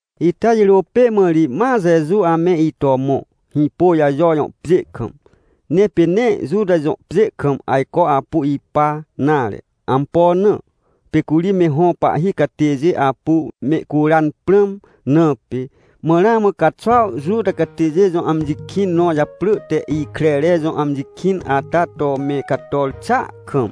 Ita jirô pê mã ri ma Jeju ame ito mõ, Hĩpôjajo jõ pjê kam, ne pê nee Juta jõ pjê kam ajco apu ipa nare. Ampo na? Pê curi me hõ pahhi catêjê apu mehcuran prãm na pê. Mã ramã caxuaw Juta catêjê jõ amji kĩn nõ japrỳ te Ikrere jõ amji kĩn ata to me cator xàa kam.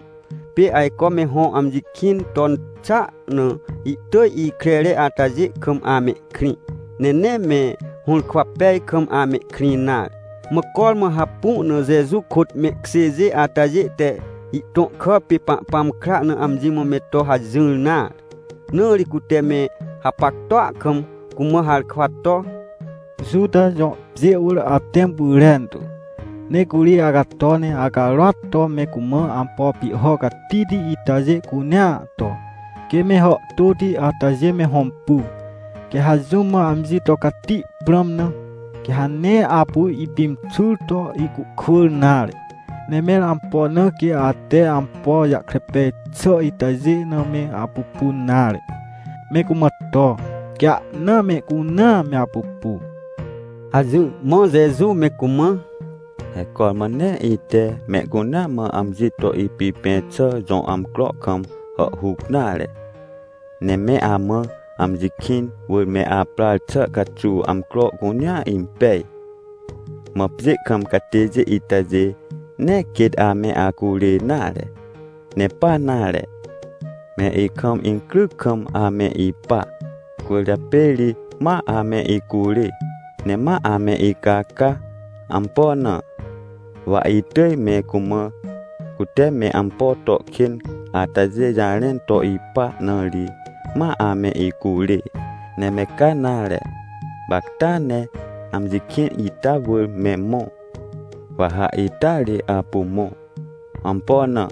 Pê ajco me hõ amji kĩn ton xàa na, ihtỳj ikrere atajê kam amehkrĩ, ne nee me hũrkwa pej kam amehkrĩ nare. Mã cormã hapu na Jeju kôt mehkjêjê atajê te ihtõ kà pê Pahpãm kra na amji mã me to hajỹr nare, na ri cute me hapactua kam cumã harkwa to: — Juta jõ pjê wỳr atẽm pyrentu, ne curi acato, ne acarôat to me cumã ampo pihho catihti itajê cunea to, quê me hàhtôti atajê me hõmpu! Quê ha jũm mã amji to cati prãm na, quê ha nee apu ipimxur to ihcuhkwỳr nare. Ne mẽr ampo na quê ate ampo jahkre pej xà itajê na me apupun nare? Me cumã to, quê ahna mehcunea me apupu! — hajỹr. Mã Jeju me cumã: — He cormã nee ite mehcunea mã amji to ipipẽ xà jõ amcro kam hàhhuc nare! Ne me amã amji kĩn wỳr me aprar xà caxuw amcro cunea impej. Mã pjê kam catêjê itajê nee quêt ame acurê nare. Ne pa nare, me ikam incryc kam ame ipa. Cwỳrjapê ri ma ame icurê, ne ma ame icaca! Ampo na? Wa itỳj me cumã, cute me ampo to kên atajê jarẽn to ipa na ri, ma ame icurê. Ne me ca nare, gapacta ne amji kĩn ita wỳr me mõ. Waha ita ri apu mõ. Ampo na?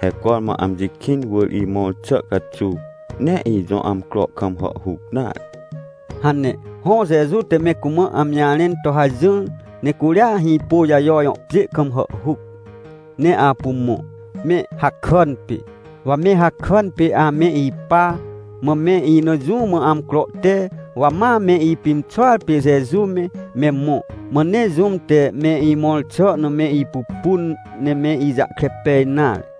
He cormã amji kĩn wỳr imõr xà caxuw nee ijõ amcro kam hàhhuc nare — hane. Hõ, Jeju te me cumã amji jarẽn to hajỹr, ne curia Hĩpôjajo jõ pjê kam hàhhuc, ne apu mõ, me hakàn pê. Wa me hakàn pê ame ipa, mã me ina jũ mã amcro te, wa ma me ipimxuar pê Jeju me, me mõ. Mã nee jũm te me imõr xà na me ipupun, ne me ijahkre pej nare.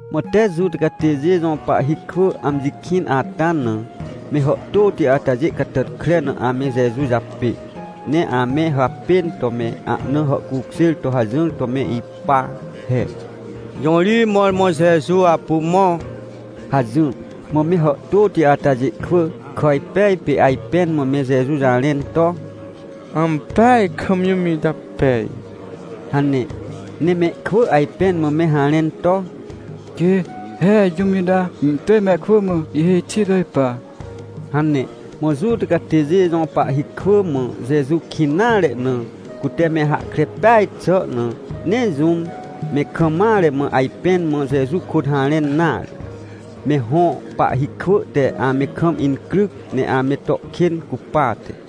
Mã tee Juta catêjê jõ pahhi kwỳ amji kĩn ata na, me hàhtôti atajê catàtkre na ame Jeju japê. Ne ame hapên to me ahna hàhcukjêr to hajỹr to me ipa he: — Jõ ri mõrmõ Jeju apu mõ? — hajỹr. Mã me hàhtôti atajê kwỳ kàjpej pê, ajpẽn mã me Jeju jarẽn to: — Ampeaj kam jũm ita pej — hane. Ne mehkwỳ ajpẽn mã me harẽn to: — Quê, he jũm ita ihtỳj mehkwỳ mã ihhêj xi to ipa — hane. Mã Juta catêjê jõ pahhi kwỳ mã Jeju kĩn nare na, cute me hahkre peaj xà na, nee jũm me kam mare mã ajpẽn mã Jeju kôt harẽn nare, me hõ pahhi kwỳ te ame kam incryc, ne ame to kên cupate.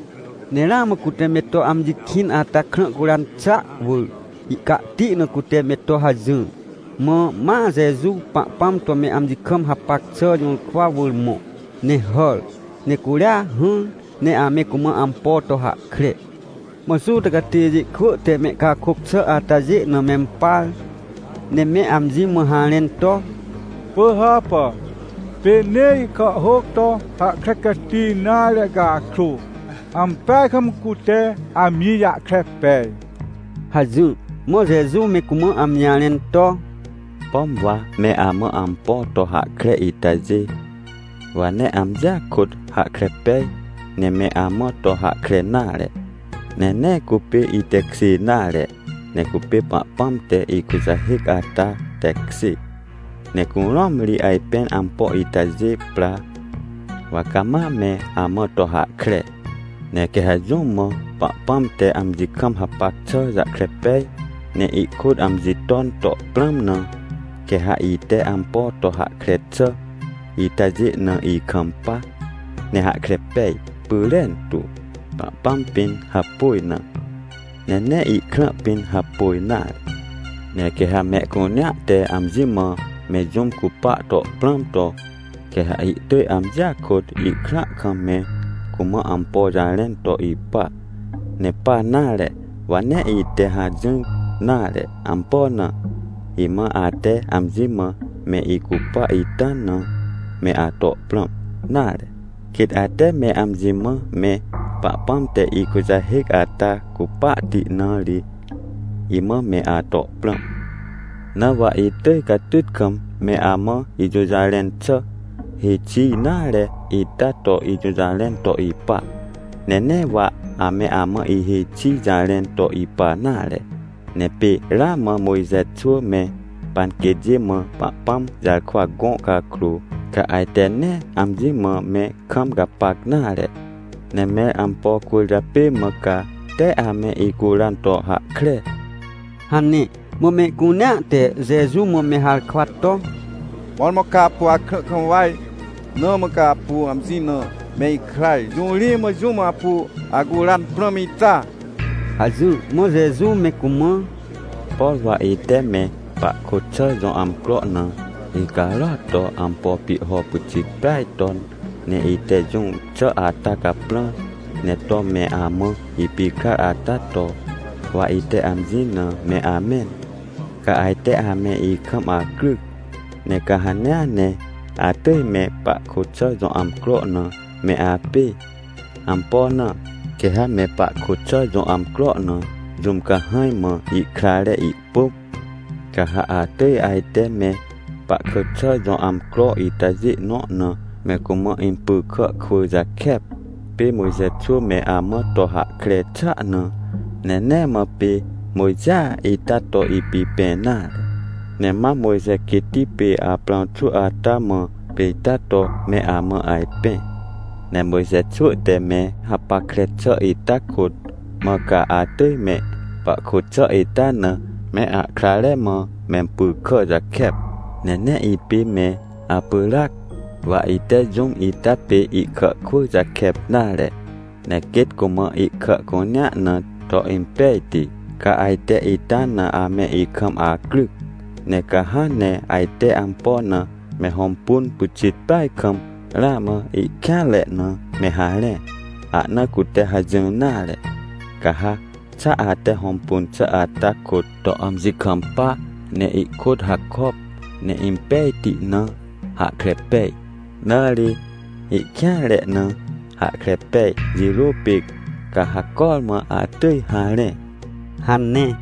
Ne ramã cute me to amji kĩn ata krã curan xà wỳr, ihcahti na cute me to hajỹr. Mã ma Jeju Pahpãm to me amji kam hapac xà jũrkwa wỳr mõ ne hàr, ne curia hỹr ne ame cumã ampo to hahkre. Mã Juta catêjê kwỳ te mehcakôc xà atajê na mempar, ne me amji mã harẽn to: — Pỳhàpà! Pê nee ihkàhhôc to hahkre cati nare cakrô, ampeaj kam cute amji jahkre pej — hajỹr. Mã Jeju me cumã amji jarẽn to: — Pom wa me amã ampo to hahkre itajê, wa nee amjia kôt hahkre pej, ne me amã to hahkre nare, ne nee cupê itekjê nare. Ne cupê Pahpãm te ikujahêc ata tekjê. Ne curũam ri ajpên ampo itajê pra, wa cama me amã to hahkre. Ne quê ha jũm mã Pahpãm te amji kam hapac xà jahkre pej, ne ihkôt amji ton to prãm na, quê ha ite ampo to hahkre xà itajê na ikampa, ne hahkre pej pyrentu, Pahpãm pĩn hapôj na, ne nee ikrã pĩn hapôj nare. — Ne quê ha mehcunea te amji mã me jũm cupa to prãm to, quê ha ihtỳj amjia kôt, ihkrãa kam me cumã ampo jarẽn to ipa. Ne pa nare, wa nee ite hajỹr nare. Ampo na? Imã ate amji mã me icupa ita na me ato prãm nare, quêt ate me amji mã me Pahpãm te ikujahêc ata cupahti na ri, imã me ato prãm. Na wa itỳj catyt kam me amã ijũjarẽn xà, hêj xi nare ita to ijũjarẽn to ipa, ne nee wa ame amã ihêj xi jarẽn to ipa nare. Ne pê ramã Mojxe xwỳ me panquêtjê mã Pahpãm jarkwa gõ cakrô, ca ajte nee amji mã me kam gapac nare, ne mẽr ampo cwỳrjapê mã ca tee ame icuran to hahkre? — hane. Mã mehcunea te Jeju mã me harkwa to: — Mõrmõ ca apu akrã kam waj, na mã ca apu amji na me ikraj! Jõ ri mã jũm apu acuran prãm ita? — hajỹr. Mã Jeju me cumã: — Por wa ite me pahkôt xà jõ amcro na icarôat to ampo pihho pyxit peaj ton, ne ite jũm xà ata caprãr, ne to me amã ipikrar ata to, wa ite amji na me amẽn, ca ajte ame ikam acryc. Ne ca hanea ne atỳj me pahkôt xà jõ amcro na me apê. Ampo na? Quê ha me pahkôt xà jõ amcro na jũm cahãj mã ihkrare ihpỳm, ca ha atỳj ajte me pahkôt xà jõ amcro itajê nõ na me cumã impy kà kwỳ jakep, pê Mojxe xwỳ me amã to hahkre xàa na. Ne nee mã pê Mojxea ita to ipipẽ nare, ne mam Mojxe quêtti pê Aprãw xwỳ ata mã pê ita to me amã ajpẽ. Ne Mojxe xwỳ te me hapackre xà ita kôt, mã ca atỳj me pahkôt xà ita na me ahkrare mã mempy kà jakep. Ne nee ipê me apyràc, wa ite jũm ita pê ihkà kwỳ jakep nare, ne quêt cumã ihkà cunea na to impejti, ca ajte ita na ame ikam acryc? Ne ca hãn ne ajte ampo na me hõmpun pyxit peaj kam, ramã ihkêanre na me harẽ. Ahna cute hajỹr nare, ca ha xa ate hõmpun xà ata kôt to amji kampa, ne ihkôt hakop, ne impejti na hahkre pej, nare, ihkêanre na hahkre pej jirô pê, ca ha cormã atỳj harẽ — hane.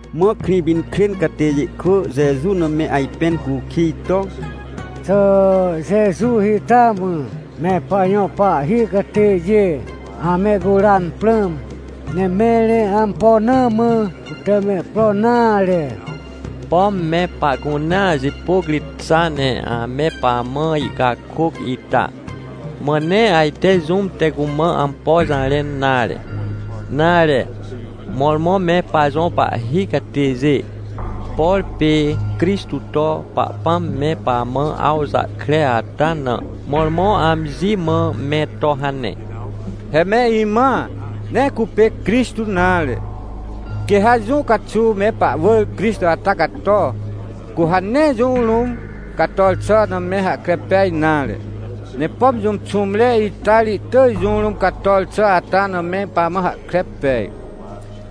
Mã Krĩpinkrên catêjê kwỳ Jeju na me ajpẽn cukij to: — Xà Jeju ita mã me pajõ pahhi catêjê amehcuran prãm? Ne mẽr ampo na mã cute mehpro nare? Pom me pahcunea jipôc ri xa ne ame pamã ihcakôc ita? Mã nee ajte jũm te cumã ampo jarẽn nare? Nare, mõrmõ me pajõ pahhi catêjê, por pê Crixtô toPahpãm me pamã awjahkre ata na, mõrmõ amji mã me to hane? He me imãa, nee cupê Crixtô nare! Quê ha jũ caxuw me pahwỳr Crixtô ata cato, cu ha nee jũ rũm cator xà na me hahkre pej nare. Ne pom jũm xũmre ita ri ihtỳj jũ rũm cator xà ata na me pamã hahkre pej,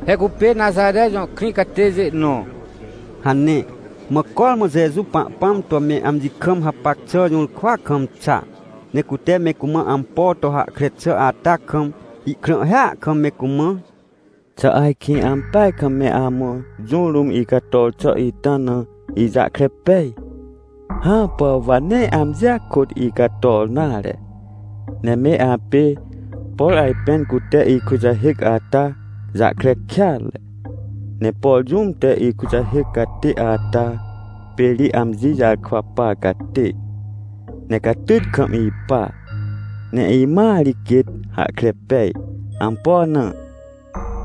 he cupê Naxare jõ krĩ catêjê nõ — hane. Mã cormã Jeju Pahpãm to me amji kam hapac xà jũrkwa kam xa, ne cute me cumã ampo to hahkre xà ata kam, ihkrãhhia kam me cumã: — Xà ajkĩ ampeaj kam me amã jũ rũm icator xà ita na ijahkre pej? Hãpà! Wa nee amjia kôt icator nare, ne me apê, por ajpên cute ikujahêc ata jahkre kêatre. Ne por jũm te ikujahêc catê ata pê ri amji jarkwa par catê, ne catyt kam ipa! Ne imãa ri quêt hahkre pej. Ampo na?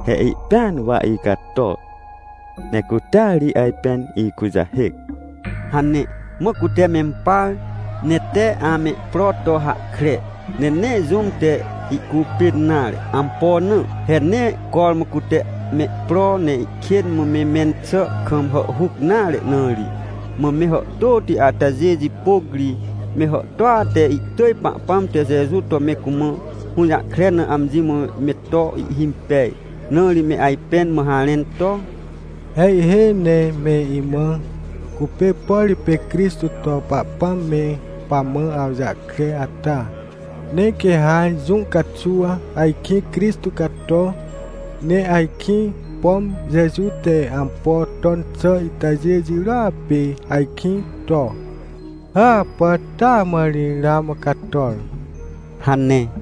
He ihpĩan wa icator, ne cutea ri ajpên ikujahêc — hane. Mã cute mempar, ne tee amehpro to hahkre, ne nee jũm te ihcupên nare. Ampo na? He nee cormã cute mehpro, ne ihkên mã me mẽn xà kam hàhhuc nare na ri. Mã me hàhtôti atajê jipôc ri me hàhtôa te ihtỳj Pahpãm te Jeju to me cumã hũjahkre na amji mã meto ihhimpej. Na ri me ajpẽn mã harẽn to: — He ihhêj ne me imãa, cupê, por pê Crixtô to Pahpãm me pamã awjahkre ata! Ne quê ha jũ caxuw ajkĩ Crixtô cato, ne ajkĩ, pom Jeju te ampo ton xà itajê jirôa pê ajkĩ to? Hãpà. Taa mã ri ramã cator — hane.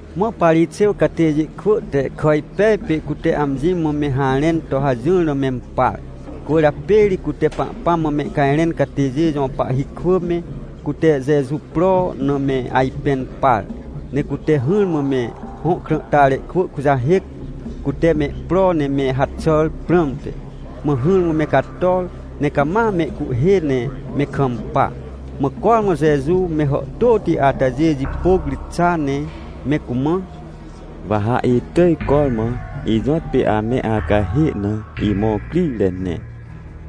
Mã Parixêw catêjê kwỳ te kàjpej pê cute amji mã me harẽn to hajỹr na mempar, cwỳrjapê ri cute Pahpãm mã mehcajrẽn catêjê jõ pahhi kwỳ me, cute Jeju pro na me ajpẽn par. Ne cute hỹrmã me hõ krãhtare kwỳ kujahêc, cute mehpro ne me haxàr prãmte. Mã hỹrmã me cator ne cama mehcuhhê ne me kampa. Mã cormã Jeju me hàhtôti atajê jipôc ri xa ne me cumã: — Wa ha itỳj cormã ijõtpê ame acahê na imõr crire ne,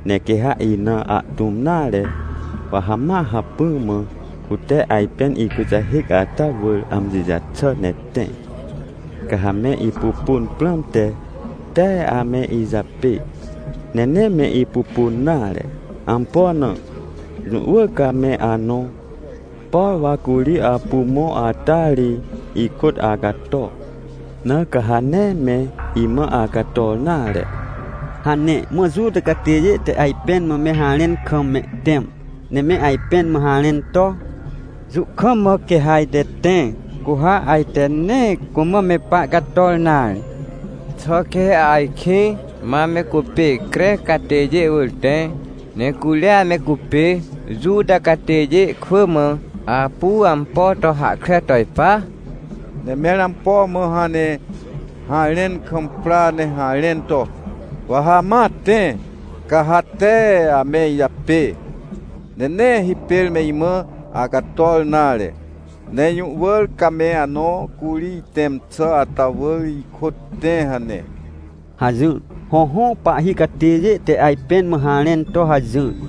ne quê ha ina ahtũm nare, wa ha ma hacpỹ mã cute ajpên ikujahêc ata wỳr amji jaxà ne tẽ. Ca ha me ipupun prãmte, tee ame ijapê ne nee me ipupun nare. Ampo na? Jũ wỳr ca me anõ, por wa curi apu mõ ata ri ikôt acato! Na ca ha nee me imã acator nare! — hane. Mã Juta catêjê te ajpẽn mã me harẽn kam mehtẽm, ne me ajpẽn mã harẽn to: — Jũ kam mã quê ha ajte tẽ, cu ha ajte nee cumã me pahcator nare? Xà quê ha ajkĩ ma me cupê Crec catêjê jõ pjê wỳr tẽ, ne curia me cupê Juta catêjê kwỳ mã apu ampo to hahkre to ipa? Ne mẽr ampo mã hãn ne harẽn kam pra ne harẽn to: “Wa ha ma tẽ, ca ha tee ame ijapê, ne nee hipêr me imã acator nare”, ne “Jũ wỳr ca me anõ curi itẽm xà ata wỳr ikôt tẽ” hane? — hajỹr. Hõhõ, pahhi catêjê te ajpẽn mã harẽn to hajỹr.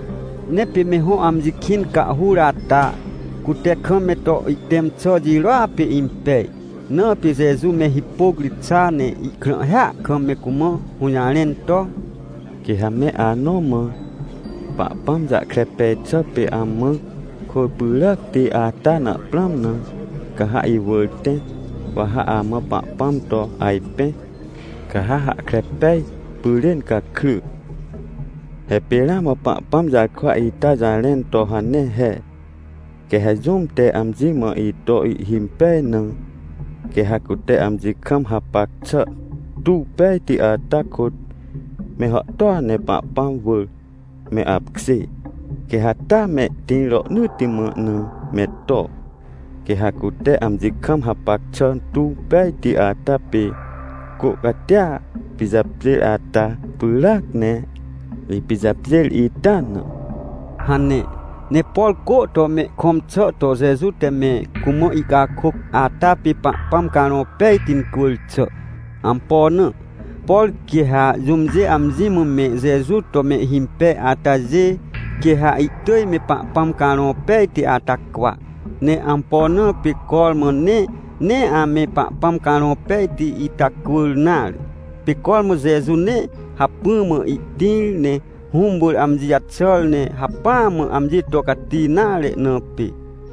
Ne pê me hõ amji kĩn cahhur ata, cute kam me to ihtẽm xà jirôa pê impej, na pê Jeju me hipôc ri xa, ne ihkrãhhia kam me cumã hũjarẽn to: — Quê ha me anõ mã, Pahpãm jahkre pej xà pê amã kôr pyràcti ata na prãm na, ca ha iwỳr tẽ, wa ha amã Pahpãm to ajpẽ, ca ha hahkre pej pyrên gakry. He pê ramã Pahpãm jarkwa ita jarẽn to hane he: “Quê ha jũm te amji mã ito ihhimpej na, quê ha cute amji kam hapac xà tuw pejti atakôt me hàhtôa ne Pahpãm wỳr me apkjê, quê ha taa mehtĩr rohnỳtti mã na me to. Quê ha cute amji kam hapac xà tuw pejti ata pê cô catia pijapjêr ata pyràac, ne ipijapjêr ita na” — hane. Ne por cô to mehkõm xà to Jeju te me cumã ihcakôc ata pê Pahpãm Carõ Pejti incwỳr xà. Ampo na? Por quê ha jũmjê amji mã me Jeju to mehhimpej atajê, quê ha ihtỳj me Pahpãm Carõ Pejti ata cwa. Ne ampo na pê cormã ne nee ame Pahpãm Carõ Pejti ita cwỳr nare? Pê cormã Jeju nee hacpỹ mã ihtĩr ne Hũm wỳr amji jaxàr, ne hacpỹa mã amji to cati nare na pê.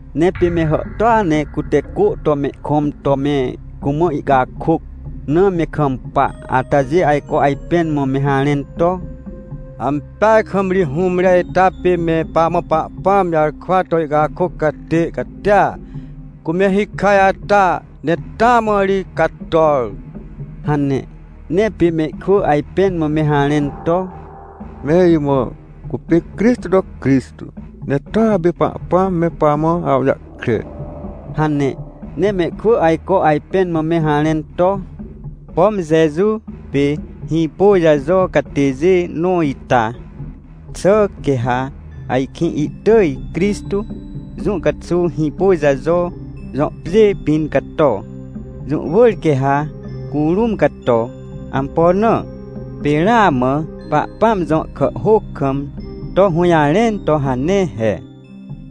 Ne pê me hàhtôa ne cute cô to mehkõm to me cumã ihcakôc na me kampa, atajê ajco ajpẽn mã me harẽn to: — Ampeaj kam ri hũmre ita pê me pamã Pahpãm jarkwa to ihcakôc catê catia, cu me hikaj ata, ne taa mã ri cator — hane. Ne pê mehkwỳ ajpẽn mã me harẽn to: — Me imã cupê Crixtô to Crixtô, ne toa pê Pahpãm me pamã awjahkre — hane. Ne mehkwỳ ajco ajpẽn mã me harẽn to: — Pom Jeju pê Hĩpôjajo catêjê nõ ita? Xà quê ha ajkĩ ihtỳj Crixtô jũ caxuw Hĩpôjajo jõ pjê pĩn cato? Jũ wỳr quê ha curũm cato! Ampo na? Pê ramã Pahpãm jõ kàhhôc kam to hũjarẽn to hane he: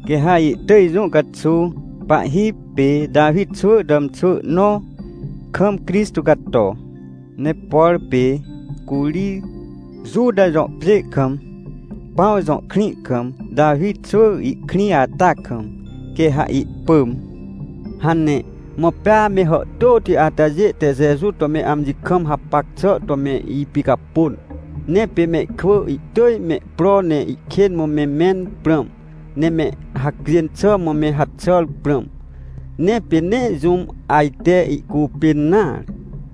“Quê ha ihtỳj jũ caxuw pahhi pê Tawi xwỳ tàmxwỳ nõ kam Crixtô cato, ne por pê curi Juta jõ pjê kam, Pãw jõ krĩ kam Tawi xwỳ ihkrĩ ata kam, quê ha ihpỳm” — hane. Mã pea me hàhtôti atajê te Jeju to me amji kam hapac xà to me ipicapôn. Ne pê mehkwỳ ihtỳj me pro ne ihkên mã me mẽn prãm, ne me hacjên xà mã me haxàr prãm. Ne pê nee jũm ajte ihcupên nare.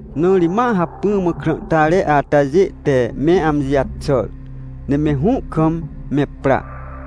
Na ri ma hacpỹ mã krãhtare atajê te me amji jaxàr, ne me hũ kam me pra,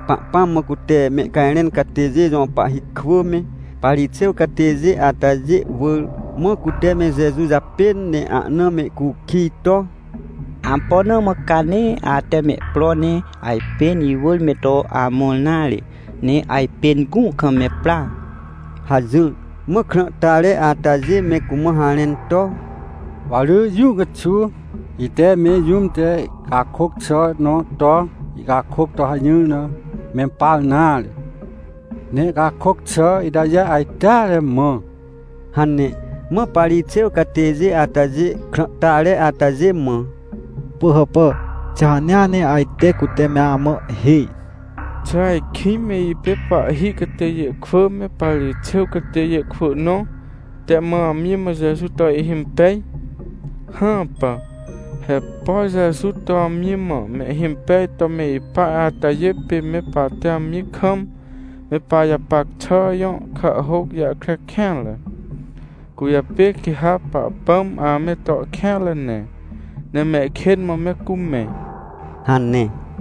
Pahpãm mã cute mehcajrẽn catêjê jõ pahhi kwỳ me, Parixêw catêjê atajê wỳr. Mã cute me Jeju japên ne ahna mehcukij to: — Ampo na mã ca nee ate mehpro ne ajpên iwỳr me to amõr nare, ne ajpên gũ kam me pra? — hajỹr. Mã krãhtare atajê me cumã harẽn to: — Wa rỳ jũ caxuw ite me jũm te ihcakôc xà nõ to ihcakôc to hajỹr na mempar nare, ne ihcakôc xà itajê ajteare mã — hane. Mã Parixêw catêjê atajê krãhtare atajê mã: — Pỳhàpà? Xà hanea ne ajte cute me amã ihhêj? Xà ajkĩ me ipê pahhi catêjê kwỳ me Parixêw catêjê kwỳ nõ te mã amji mã Jeju to ihimpej? Hãpà! He por Jeju to amji mã mehhimpej to me ipa atajê pê me pahte amji kam me pajapac xà jõ kàhhôc jahkre kêatre! Cwỳrjapê quê ha Pahpãm ame to kêanre ne, ne mehkên mã me cumẽ — hane.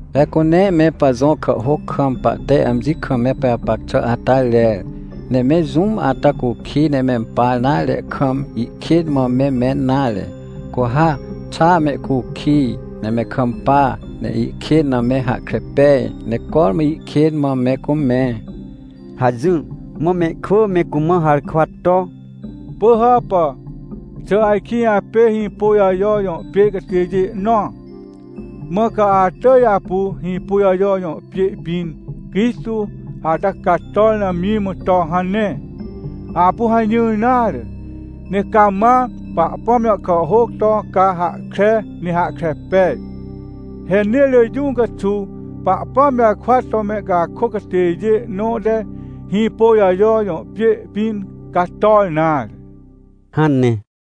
— He cu nee me pajõ kàhhôc kam pahte amji kam me pajapac xà ata rer, ne me jũm ata cukij ne mempar nare kam ihkên mã me mẽn nare. Cu ha xa mehcukij, ne me kampa, ne ihkên na me hahkre pej, ne cormã ihkên mã me cumẽ — hajỹr. Mã mehkwỳ me cumã harkwa to: — Pỳhàpà, xà ajkĩ apê Hĩpôjajo jõ pjê catêjê nõa, mã ca atỳj apu Hĩpôjajo jõ pjê pĩn Crixtô ata cator na amji mã to hane? Apu hajỹr nare, ne cama Pahpãm jõ kàhhôc to ca hahkre ne hahkre pej, he nee rỳ jũ caxuw Pahpãm jarkwa to mehcakôc catêjê nõ te Hĩpôjajo jõ pjê pĩn cator nare — hane.